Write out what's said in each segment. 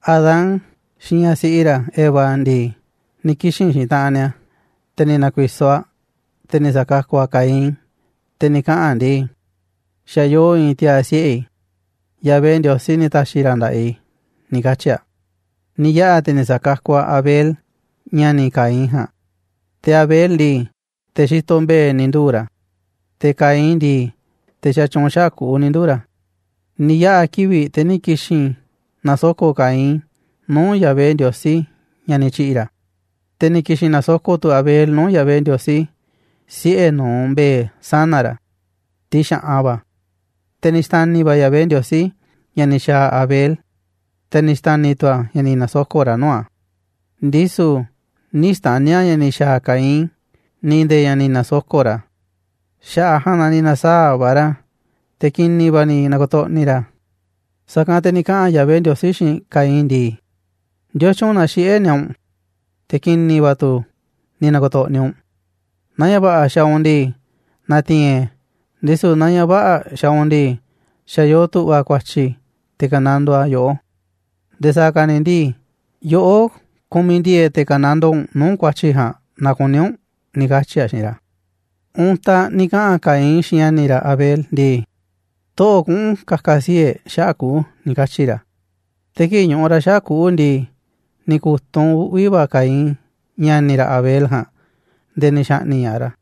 Adán xiinꞌ ñaꞌ siꞌi ra̱ Eva ndii, ni̱ kixi̱n xiinꞌ taꞌanꞌ ni̱a̱, te̱ ni̱ na̱ku̱i̱so̱ aꞌ, te̱ ni̱ sa̱kakuꞌ aꞌ Caín. Te̱ ni̱ kaꞌa̱n aꞌ ndii: ―Xa̱ yoo i̱i̱n tiaa̱ siꞌe̱ i̱, Yahvé Ndiosí ni̱ ta̱xi̱ ra̱ nda̱ꞌaꞌ i̱ ―ni̱ katyi̱ aꞌ. Ni̱ yaꞌa̱ te̱ ni̱ sa̱kakuꞌ aꞌ Abel, ña̱ni̱ Caín ja̱a̱nꞌ. Te̱ Abel ndii, te̱ xitoꞌ mbe̱e̱ ni̱ nduu̱ ra̱, te̱ Caín ndii, te̱ xatyuunꞌ xaꞌa̱ꞌ kuꞌu̱ ni̱ nduu̱ ra̱. Ni̱ yaꞌa̱ kivi̱ꞌ, te̱ ni̱ ki̱xi̱n na̱soko̱ꞌ Caín nuu̱ꞌ Yahvé Ndiosí ña̱ ni̱ tyi̱ꞌi̱ ra̱. Te̱ ni̱ ki̱xi̱n na̱soko̱ꞌ tu̱ Abel nuu̱ꞌ Yahvé Ndiosí, siꞌe̱ nu̱uꞌ mbe̱e̱ sana̱ ra̱, tiꞌ xa̱ꞌan va̱. Te̱ ni̱ xta̱ni̱ va̱ Yahvé Ndiosí ña̱ ni̱ xa̱a̱ Abel, te̱ ni̱ xta̱ni̱ tu̱ a̱ ña̱ ni̱ na̱soko̱ꞌ ra̱ nuu̱ꞌ a̱, ndisu̱ nï̱ xta̱ni̱ a̱ ña̱ ni̱ xa̱a̱ Caín ni̱ nde̱e̱ ña̱ ni̱ na̱soko̱ꞌ ra̱. Xaꞌa̱ꞌ a̱ ja̱a̱nꞌ na ni̱ na̱saa̱ꞌ va̱ ra̱, te̱ ki̱ni̱ va̱ ni̱ na̱ko̱to̱ꞌni̱ ra̱. Sa̱kanꞌ te̱ ni̱ kaꞌa̱n Yahvé Ndiosí xiinꞌ Caín ndii: ―¿Ndiotyun na xiꞌé ni̱a̱ u̱nꞌ, te̱ ki̱ni̱ va̱ tu̱ ni̱ na̱ko̱to̱ꞌni̱ u̱nꞌ? Naaꞌ ña̱ va̱ꞌa̱ xaaꞌ u̱nꞌ ndii na̱ti̱i̱n e̱ꞌ e̱, ndisu̱ naaꞌ ña̱ vä̱ꞌa̱ xaaꞌ u̱nꞌ ndii, xa̱ yoo tu̱ꞌva̱ ku̱a̱tyi̱ te̱ ka̱nandoo a̱ yoꞌó, nde̱e̱ sa̱a̱ ka̱ ni̱ ndii, yoꞌó kumiꞌ ndi̱e̱e̱ꞌ te̱ ka̱nandoo u̱nꞌ nuu̱ꞌ ku̱a̱tyi̱ ja̱a̱nꞌ naaꞌ kuní u̱nꞌ ―ni̱ katyi̱ a̱ xiinꞌ ra̱. Untaꞌ ni̱ kaꞌa̱n Caín xiinꞌ ña̱ni̱ ra̱ Abel ndii: ―Toꞌo̱ꞌ kuꞌu̱n ka̱ka̱ sii̱ꞌ e̱ꞌ xaꞌa̱ꞌ kuꞌu̱ ―ni̱ katyi̱ ra̱. Te̱ kii̱ꞌ ñuꞌuꞌ ra̱ xaꞌa̱ꞌ kuꞌu̱ ndii, ni̱ ku̱tunꞌ uꞌvi̱ va̱ Caín ña̱ni̱ ra̱ Abel ja̱a̱nꞌ nde̱e̱ ni̱ xa̱ꞌni̱ꞌ ña̱ꞌaꞌ ra̱.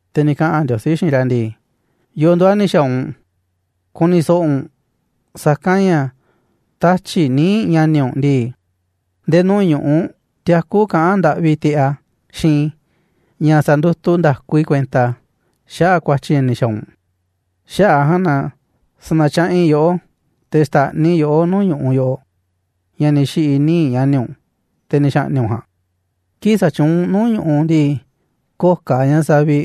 Te̱ ni̱ kaꞌa̱n Ndiosí xiinꞌ ra̱ ndii: ―¿Yo̱o̱ nduuꞌ a̱ ni̱ xa̱a̱ u̱nꞌ?, ku̱ni̱ so̱ꞌo̱ u̱nꞌ, sa̱kanꞌ ña̱ tatyi̱ꞌ níiꞌ ña̱ni̱ u̱nꞌ ndii, nde̱e̱ nuu̱ꞌ ñu̱ꞌuꞌ tiakú kaꞌán ndaꞌvi tiꞌeꞌ a̱ xiinꞌ i̱ ña̱ sa̱ndutuꞌ nda̱ku i̱ kuenta xaꞌa̱ꞌ ku̱a̱tyi̱ ña̱ ni̱ xa̱a̱ u̱nꞌ. Xaꞌa̱ꞌ a̱ ja̱a̱nꞌ na sa̱na̱tyaꞌanꞌ i̱ yoꞌó, te̱ xta̱ꞌniꞌ i̱ yoꞌó nuu̱ꞌ ñu̱ꞌuꞌ yoꞌoꞌ, ña̱ ni̱ xi̱ꞌi̱ níiꞌ ña̱ni̱ u̱nꞌ, te̱ ni̱ xa̱ꞌni̱ꞌ u̱nꞌ ja̱a̱nꞌ. Kii̱ꞌ sa̱tyuunꞌ u̱nꞌ nuu̱ꞌ ñu̱ꞌuꞌ ndii, köo̱ꞌ ka̱ ña̱ saviꞌ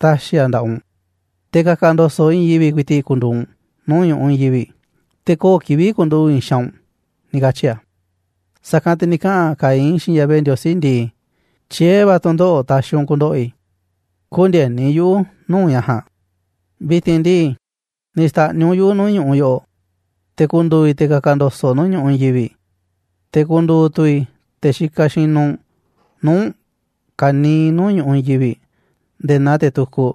ta̱xi̱ a̱ nda̱ꞌaꞌ u̱nꞌ, te̱ ka̱ka̱ ndo̱so̱ꞌ i̱i̱n yivi̱ꞌ ku̱i̱ti̱ꞌ ku̱ndu̱u̱ u̱nꞌ nuu̱ꞌ ñu̱ꞌuꞌ i̱i̱n yivi̱ꞌ, te̱ köo̱ꞌ kivi̱ꞌ ku̱nduꞌu̱ꞌ i̱i̱n xaanꞌ u̱nꞌ ―ni̱ katyi̱ a̱. Sa̱kanꞌ te̱ ni̱ kaꞌa̱n Caín xiinꞌ Yahvé Ndiosí ndii: ―Tyié va̱ tu̱ndoꞌo̱ꞌ taxiꞌ u̱nꞌ ku̱ndo̱ꞌo̱ i̱, kü̱ndi̱e̱ni yuꞌu̱ nuu̱ꞌ ña̱ ja̱a̱nꞌ. Vi̱ti̱n ndii, ni̱ xta̱ꞌniꞌ u̱nꞌ yuꞌu̱ nuu̱ꞌ ñu̱ꞌuꞌ yoꞌoꞌ, te̱ ku̱ndu̱u̱ i̱ te̱ ka̱ka̱ ndo̱so̱ꞌ nuu̱ꞌ ñu̱ꞌuꞌ i̱i̱n yivi̱ꞌ, te̱ ku̱ndu̱u̱ tu̱ i̱ te̱ xikaꞌ xinuꞌ nuu̱ꞌ u̱nꞌ ka̱niiꞌ nuu̱ꞌ ñu̱ꞌuꞌ i̱i̱n yivi̱ꞌ nde̱e̱ naa te̱ tukuꞌ.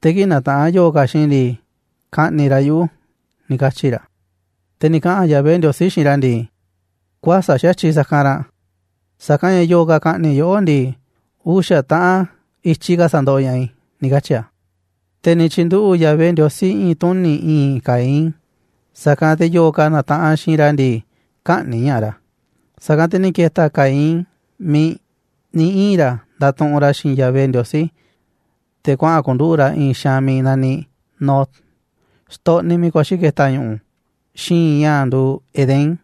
Te̱ kii̱ꞌ na̱taꞌanꞌ yo̱o̱ ka̱ xiinꞌ i̱ ndii, ka̱ꞌni̱ꞌ ra̱ yuꞌu̱ ―ni̱ katyi̱ ra̱. Te̱ ni̱ kaꞌa̱n Yahvé Ndiosí xiinꞌ ra̱ ndii: ―Kuäsa̱ꞌ xa̱tyiꞌ sa̱kanꞌ ranꞌ, sa̱kanꞌ ña̱ yo̱o̱ ka̱ ka̱ꞌni̱ꞌ yoꞌó ndii, uxa̱ taꞌan i̱tyiꞌ ka̱ sa̱ndoꞌoꞌ ña̱ꞌaꞌ i̱ ―ni̱ katyi̱ a̱. Te̱ ni̱ tyi̱nduꞌu̱ꞌ Yahvé Ndiosí i̱i̱n tuni̱ i̱i̱nꞌ Caín, sa̱kanꞌ te̱ yo̱o̱ ka̱ na̱taꞌanꞌ xiinꞌ ra̱ ndii, kä̱ꞌni̱ꞌ ña̱ꞌaꞌ ra̱. Sa̱kanꞌ te̱ ni̱ ke̱ta̱ Caín miiꞌ ni̱ ii̱n ra̱ ndatuꞌunꞌ ra̱ xiinꞌ Yahvé Ndiosí, te̱ kuaꞌa̱n ku̱nduꞌu̱ꞌ ra̱ i̱i̱n xaanꞌ miiꞌ naniꞌ Nod, xtoꞌniꞌ miiꞌ kuaxi̱ ke̱ta̱ ñu̱ꞌu̱ xi̱i̱nꞌ ña̱ nduuꞌ Edén.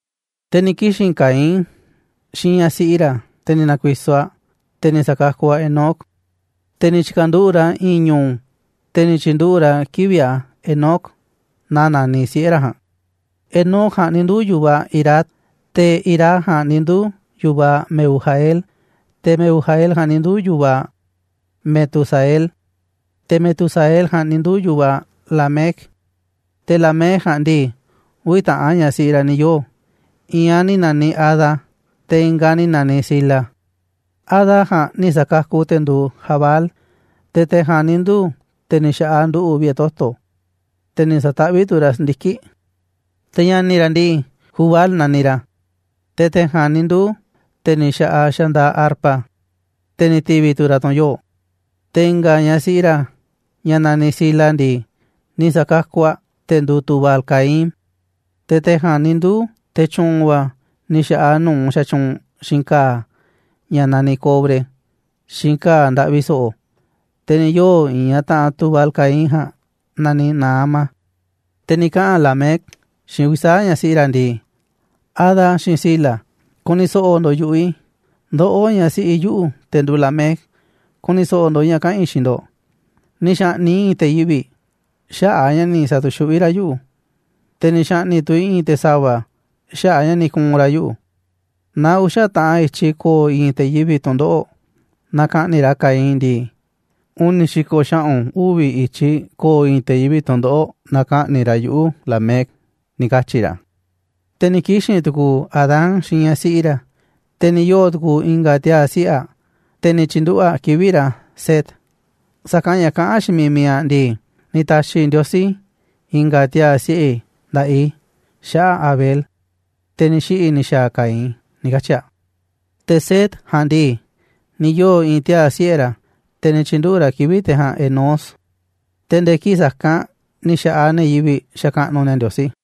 Te̱ ni̱ kixi̱n Caín xiinꞌ ñaꞌ siꞌi ra̱, te̱ ni̱ na̱ku̱i̱so̱ aꞌ, te̱ ni̱ sa̱kakuꞌ aꞌ Enoc, te̱ ni̱ tyi̱ka̱nduꞌu̱ꞌ ra̱ i̱i̱n ñu̱u̱, te̱ ni̱ tyi̱nduꞌu̱ꞌ ra̱ kivi̱ꞌ a̱ Enoc naa naniꞌ siꞌe̱ ra̱ ja̱a̱nꞌ. Enoc ja̱a̱nꞌ ni̱ nduu̱ yu̱vaꞌ Irad, Te̱ Irad ja̱a̱nꞌ ni̱ nduu̱ yu̱vaꞌ Mehujael, te̱ Mehujael ja̱a̱nꞌ ni̱ nduu̱ yu̱vaꞌ Metusael, te̱ Metusael ja̱a̱nꞌ ni̱ nduu̱ yu̱vaꞌ Lamec. Te̱ Lamec ja̱a̱nꞌ ndii, uvi̱ taꞌan ñaꞌ siꞌi ra̱ ni̱ yoo̱, i̱i̱n aꞌ ni̱ na̱niꞌ Ada, te̱ i̱nga̱ aꞌ ni̱ na̱niꞌ Zila. Ada ja̱a̱nꞌ ni̱ sa̱kakuꞌ te̱ nduuꞌ Jabal, te̱ te̱ ja̱a̱nꞌ ni̱ nduu̱ te̱ ni̱ xa̱ꞌaꞌ nduꞌu̱ꞌ vi̱ꞌe̱ toto̱, te̱ ni̱ sa̱taꞌvíꞌ tu̱ ra̱ si̱ndiki̱ꞌ. Te̱ ña̱ni̱ ra̱ ndii, Jubal naniꞌ ra̱, te̱ te̱ ja̱a̱nꞌ ni̱ nduu̱ te̱ ni̱ xa̱ꞌaꞌ xandaaꞌ arpa, te̱ ni̱ ti̱vi̱ tu̱ ra̱ tu̱n yoo̱ꞌ. Te̱ i̱nga̱ ña̱ siꞌi ra̱, ñaꞌ naniꞌ Zila ndii, ni̱ sa̱kakuꞌ aꞌ te̱ nduuꞌ Tubal-caín, te̱ te̱ ja̱a̱nꞌ ni̱ nduu̱ te̱ tyu̱u̱n va̱ ni̱ xa̱ꞌaꞌ nu̱uꞌ xatyuunꞌ xiinꞌ ka̱a̱ ña̱ naniꞌ cobre, xiinꞌ ka̱a̱ ndaꞌvi so̱ꞌo̱. Te̱ ni̱ yoo̱ i̱i̱n ñaꞌ taꞌanꞌ Tubal-caín ja̱a̱nꞌ naniꞌ Naama. Te̱ ni̱ kaꞌa̱n Lamec xiinꞌ uvi̱ sa̱aꞌ ñaꞌ siꞌi ra̱ ndii: ―Ada xiinꞌ Zila, ku̱ni̱ so̱ꞌo̱ ndo̱ꞌ yu̱ꞌuꞌ i̱. Ndoꞌó, ñaꞌ siꞌi yuꞌu̱, te̱ nduuꞌ Lamec, ku̱ni̱ so̱ꞌo̱ ndo̱ꞌ ña̱ kaꞌa̱n i̱ xiinꞌ ndo̱ꞌ. Ni̱ xa̱ꞌni̱ꞌ i̱ i̱i̱n te̱ yivi̱ꞌ xaꞌa̱ꞌ a̱ ña̱ ni̱ sa̱tu̱xuꞌví ra̱ yuꞌu̱, te̱ ni̱ xa̱ꞌni̱ꞌ tu̱ i̱ i̱i̱n te̱ sa̱va̱ xaꞌa̱ꞌ a̱ ña̱ ni̱ ku̱u̱n ra̱ yuꞌu̱. Naaꞌ uxa̱ taꞌan i̱tyiꞌ ko̱o̱ i̱i̱n te̱ yivi̱ꞌ tu̱ndoꞌo̱ꞌ naaꞌ ka̱ꞌni̱ꞌ ra̱ Caín ndii, uni̱ xi̱ko̱ xaꞌu̱n uvi̱ i̱tyiꞌ ko̱o̱ i̱i̱n te̱ yivi̱ꞌ tu̱ndoꞌo̱ꞌ naaꞌ ka̱ꞌni̱ꞌ ra̱ yuꞌu̱, Lamec ―ni̱ katyi̱ ra̱. Te̱ ni̱ kixi̱n tu̱ku̱u̱ Adán xiinꞌ ñaꞌ siꞌi ra̱, te̱ ni̱ yoo̱ tu̱ku̱u̱ i̱nga̱ tiaa̱ siꞌe̱ aꞌ, te̱ ni̱ tyi̱nduꞌu̱ꞌ aꞌ kivi̱ꞌ ra̱ Set, sa̱kanꞌ ña̱ kaꞌán aꞌ xiinꞌ miiꞌ mi̱iꞌ aꞌ ndii: ―Ni̱ ta̱xi̱ Ndiosí i̱nga̱ tiaa̱ siꞌe̱ i̱ nda̱ꞌaꞌ i̱ xaꞌa̱ꞌ Abel, te̱ ni̱ xiꞌi̱ ni̱ xa̱a̱ Caín ―ni̱ katyi̱ aꞌ. Te̱ Set ja̱a̱nꞌ ndii, ni̱ yoo̱ i̱i̱n tiaa̱ siꞌe̱ ra̱, te̱ ni̱ tyi̱nduꞌu̱ꞌ ra̱ kivi̱ꞌ te̱ ja̱a̱nꞌ Enós. Te̱ nde̱e̱ kii̱ꞌ sa̱kanꞌ ni̱ xa̱ꞌaꞌ ne̱ yivi̱ꞌ xakaꞌnuꞌ ni̱a̱ Ndiosí.